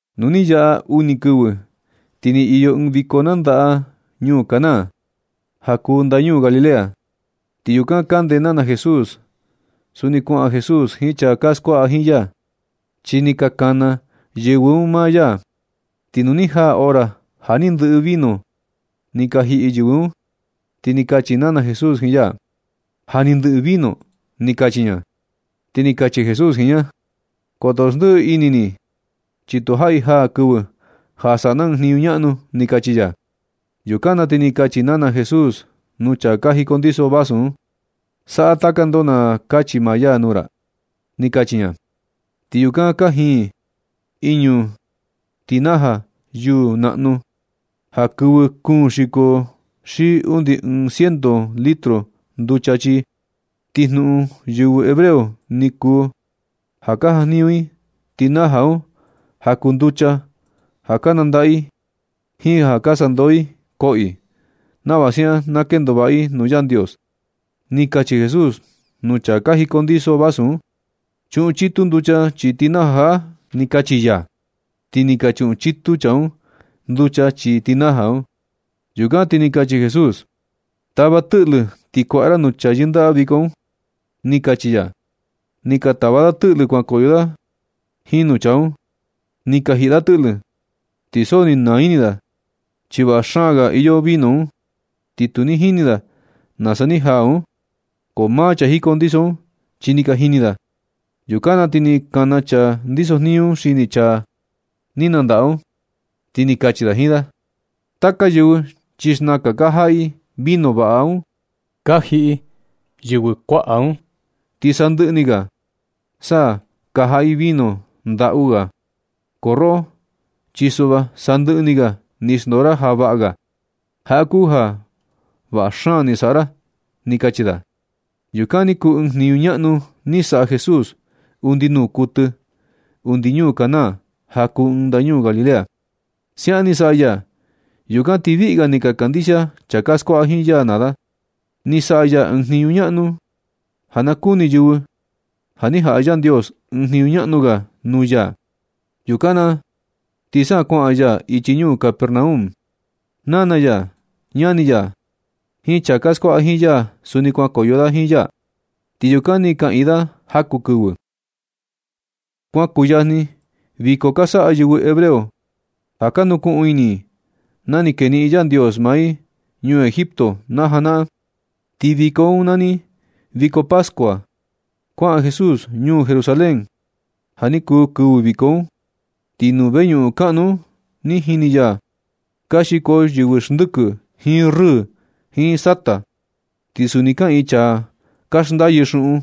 Nu ni yaꞌa uni kɨvɨ, ti ni iyo ɨɨn viko nandaꞌa ñuu Caná, ja kuu ndañuu Galilea. Ti yukan kande nana Jesús. Suni kuaꞌan Jesús jiin chaa ka skuaꞌa jiin ya, chi ni ka kana yɨvɨ un maa ya. Ti nu ni jaa hora ja ni ndɨꞌɨ vino ni ka jiꞌi yɨvɨ un, ti ni kachi nana Jesús jiin ya: ―Ja ni ndɨꞌɨ vino ―ni kachi ña. Ti ni kachi Jesús jiin ña: ―Koto xndiꞌi ni ini ni, chi tu jaꞌi jaa kɨvɨ ja saꞌa na ɨɨn jniñu ñaꞌnu ―ni kachi ya. Yukan na ti ni kachi nana Jesús nuu chaa ka jicondiso vasu un: ―Saꞌa taka ndoo na kachi maa ya nuu ra ―ni kachi ña. Ti yukan kajiin iñu tenaja yuu naꞌnu ja kɨvɨ kuun xiko xi undi ɨɨn ciento litro nducha chii. Ti jnuꞌun yɨvɨ hebreo ni kuu ja ka jajniñu i tenaja un ja kuu nducha ja ka nandaꞌa i jiin ja ka na sandoo i koꞌo i, nava siaꞌan na kendo vaꞌa i nuu Yandios. Ni kachi Jesús nuu chaa ka jicondiso vasu un: ―Chuꞌun chitu nducha chii tenaja jaꞌa ―ni kachi ya. Ti ni ka chuꞌun chitu chaa un nducha chii tenaja un. Yukan ti ni kachi Jesús: ―Tava tɨꞌlɨ ti kuaꞌa ra nuu chaa yɨndaꞌa viko un ―ni kachi ya. Ni ka tava da tɨꞌlɨ ti kuankoyo da jiin nuu chaa un. Ni ka jiꞌi da tɨꞌlɨ, ti so ni naa ini da chi vaꞌa xaan ga iyo vino un. Ti tu jini da nasa ni jaa un. Ko maa chaa ka jicondiso un chi ni ka jini da. Yukan na ti ni kana chaa ndisojniñu un xini chaa ni nandaꞌa un, ti ni kachi da jiin da: ―Taka yɨvɨ chi xnaka ka jaꞌa i vino vaꞌa un ka jiꞌi yɨvɨ kuaꞌa un, ti sandɨꞌɨ ni ga sa ka jaꞌa i vino ndaꞌu ga. Ko roꞌo, chi suꞌva sandɨꞌɨ ni ga ni xndoo ra ja vaꞌa ga. Jaꞌa kuu ja vaꞌa xaan ni saꞌa ra ―ni ka kachi da. Yukan ni kuu ɨɨn jniñu ñaꞌnu ni saꞌa Jesús undi nuu kuɨtɨ. Undi ñuu Caná, ja kuu ɨɨn ndañuu Galilea, siaꞌan ni saꞌa ya. Yukan ti viꞌi ga ni ka kandixia chaa ka skuaꞌa jiin ya naa da. Ni saꞌa ya ɨɨn jniñu ñaꞌnu un ja na kuni yɨvɨ ja ni jaꞌa Yandios ɨɨn jniñu ñaꞌnu ga nuu ya. Yukan na ti sa kuaꞌan ya ichi ñuu Capernaum. Nana ya, ñani ya, jiin chaa ka skuaꞌa jiin ya suni kuankoyo da jiin ya, ti yukan ni kaꞌiin da jaku kɨvɨ. Kuan kuyajni viko ka saꞌa yɨvɨ hebreo ja ka nukuꞌun ini i na ni keniꞌin Yandios maa i ñuu Egipto na janaꞌan. Ti viko un nani viko pascua. Kuaꞌan Jesús ñuu Jerusalén ja ni kuu kɨvɨ viko un. Ti nuu veñuꞌun kaꞌnu un ni jini ya ka xiko yɨvɨ xndɨkɨ, jiin rɨɨ, jiin sata. Ti suni kaꞌiin chaa ka xndayɨ xuꞌun.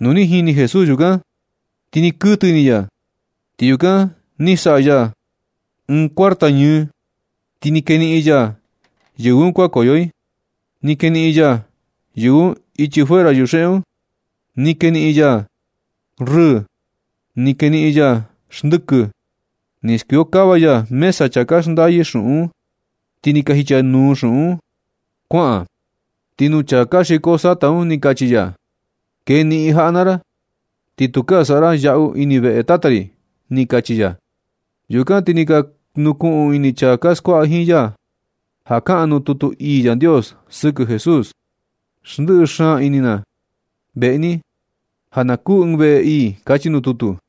Nu ni jini Jesús yukan ti ni kuɨtɨ ini ya. Ti yukan ni saꞌa ya ɨɨn cuarta ñɨɨ, ti ni keniꞌin ya yɨvɨ un kuankoyo i. Ni keniꞌin ya yɨvɨ un ichi fuera yuxeꞌe un. Ni keniꞌin ya rɨɨ, ni keniꞌin ya xndɨkɨ. Ni skuiokava ya mesa chaa ka xndayɨ xuꞌun un, ti ni ka jichanuu xuꞌun un kuaꞌan. Ti nuu chaa ka xiko sata un ni kachi ya: ―Keniꞌin jaꞌa naa ra, ti tukaa saꞌa ra yaꞌu ini veꞌe Tata ri ―ni kachi ya. Yukan ti ni ka nukuꞌun ini chaa ka skuaꞌa jiin ya ja kaꞌan nuu tutu ii Yandios sɨkɨ Jesús: “Ndɨꞌɨ xaan ini na veꞌe ni, ja na kuu ɨɨn veꞌe ii”, kachi nuu tutu.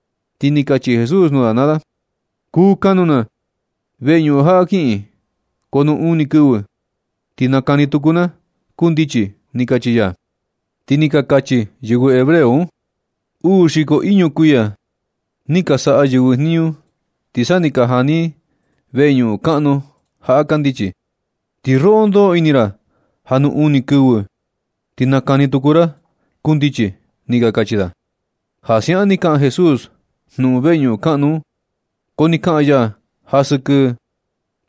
Ti ni kachi Jesús nuu da naa da: ―Kuu kanuu na veñuꞌun jaꞌa kiꞌin, ko nuu uni kɨvɨ ti nakani tuku ni na kundichi ―ni kachi ya. Ti ni ka kachi yɨvɨ hebreo un: ―Uu xiko iñu kuiya ni ka saꞌa yɨvɨ jniñu ti sa ni ka jani i veñuꞌun kaꞌnu jaꞌa kandichi, ti roꞌo ndoꞌo ini ra ja nuu uni ni kɨvɨ ti nakani tuku ra kundichi ―ni ka kachi da. Ja siaꞌan ni kaꞌan Jesús jnuꞌun veñuꞌun kaꞌnu un, ko ni kaꞌan ya ja sɨkɨ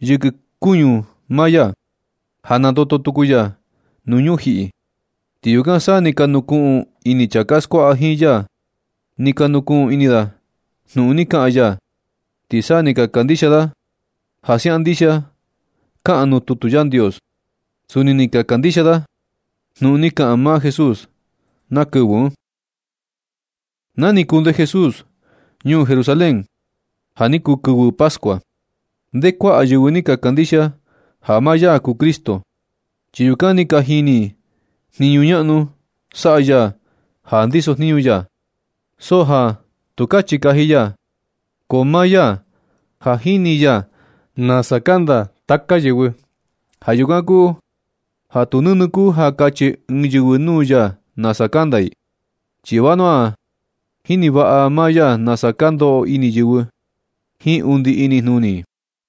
yɨkɨ kuñu maa ya, ja nandoto tuku ya nuu ñujiꞌi. Ti yukan sa ni ka nukuꞌun ini chaa ka skuaꞌa jiin ya. Ni ka nukuꞌun ini da jnuꞌun ni kaꞌan ya, ti sa ni ka kandixia da ja siaꞌan ndixia kaꞌan nuu tutu Yandios. Suni ni ka kandixia da jnuꞌun ni kaꞌan maa Jesús na kɨvɨ un. Na ni kunde Jesús ñuu Jerusalén ja ni kuu kɨvɨ Pascua, nde kuaꞌa yɨvɨ ni ka kandixia ja maa ya kuu Cristo, chi yukan ni ka jini i jniñu ñaꞌnu saꞌa ya ja ndisojniñu ya. So ja tu kachi kaji ya, ko maa ya ja jini ya nasa kanda taka yɨvɨ. Ja yukan kuu ja tu nɨnɨ kuu ja kachi ɨɨn yɨvɨ nuu ya nasa kanda i, chi vanua ja jini vaꞌa maa ya nasa ka ndoꞌo ini yɨvɨ, jiin undi inijnuni i.